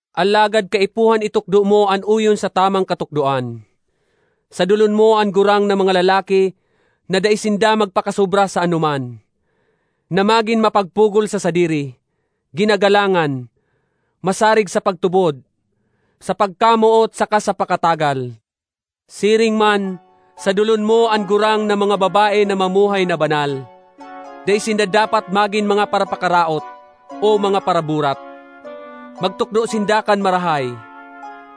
Alagad kaipuhan itukdo mo an oyon sa tamang katukdoan. Sadolon mo an gurang na mga lalaki na dai sinda magpakasobra sa anoman, na magin mapagpugol sa sadiri, ginagalangan, masarig sa pagtubod, sa pagkamoot saka sa pakatagal. Siring man sadolon mo an gurang na mga babae na mamuhay na banal. Dai sinda dapat magin mga parapakaraot, o mga paraburat. Magtukdo sinda kan marahay,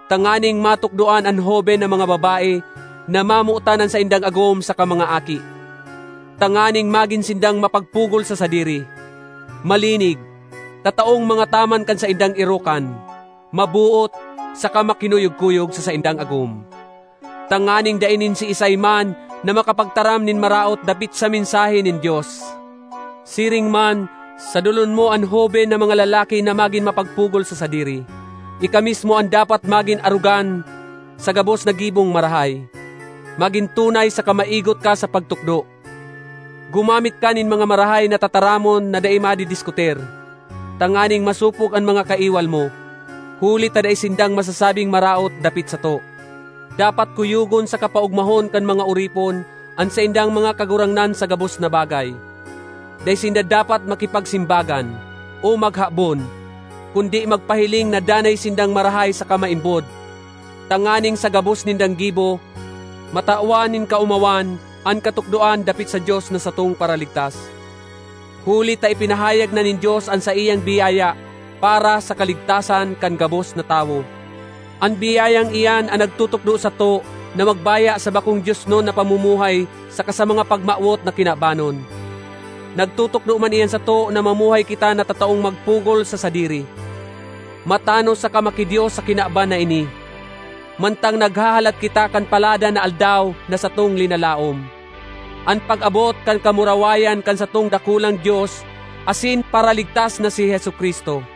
tanganing matukdoan an hoben na mga babae na mamotan an saindang agom saka mga aki, tanganing magin sindang mapagpugol sa sadiri, malinig, tataong mangataman kan saindang erokan, maboot, saka makinuyog-kuyog sa saindang agom, tanganing dai nin siisay man na makapagtaram nin maraot dapit sa mensahe nin Dios. Siring man sadolon mo an hoben na mga lalaki na magin mapagpugol sa sadiri. Ika mismo an dapat magin arogan sa gabos na gibong marahay. Magin tunay saka maigot ka sa pagtukdo. Gumamit ka nin mga marahay na tataramon na dai madidiskutir, tanganing masopog an mga kaiwal mo, huli ta dai sindang masasabing maraot dapit sato. Dapat kuyogon saka paogmahon kan mga oripon an saindang mga kagurangnan sa gabos na bagay. Dai sinda dapat makipagsimbagan o maghabon, kundi magpahiling na danay sindang marahay saka maimbod, tanganing sa gabos nindang gibo, matawan nin kaomawan an katukdoan dapit sa Dios na satong Paraligtas. Huli ta ipinahayag na nin Dios an saiyang biyaya para sa kaligtasan kan gabos na tawo. An biyayang iyan an nagtutukdo sato na magbaya sa bakong diosnon na pamumuhay saka sa mga pagmawot na kinabanon. Nagtutukdo man iyan sato na mamuhay kita na tataong magpugol sa sadiri, matanos saka maki-Dios sa kinaban na ini, mantang naghahalat kita kan paladan na Aldaw na satong linalaom, an pag-abot kan kamurawayan kan satong dakulang Dios asin Paraligtas na si Jesu-Cristo.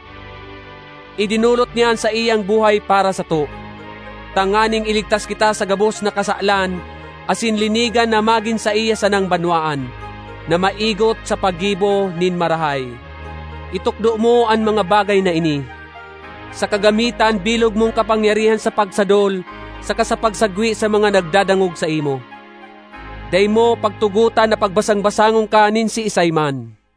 Idinolot niya an saiyang buhay para sato, tanganing iligtas kita sa gabos na kasalan asin linigan na magin saiya sanang banwaan, na maigot sa paggibo nin marahay. Itukdo mo an mga bagay na ini, saka gamita an bilog mong kapangyarihan sa pagsadol saka sa pagsagwe sa mga nagdadangog saimo. Dai mo pagtugotan na pagbasang-basangon ka nin siisay man.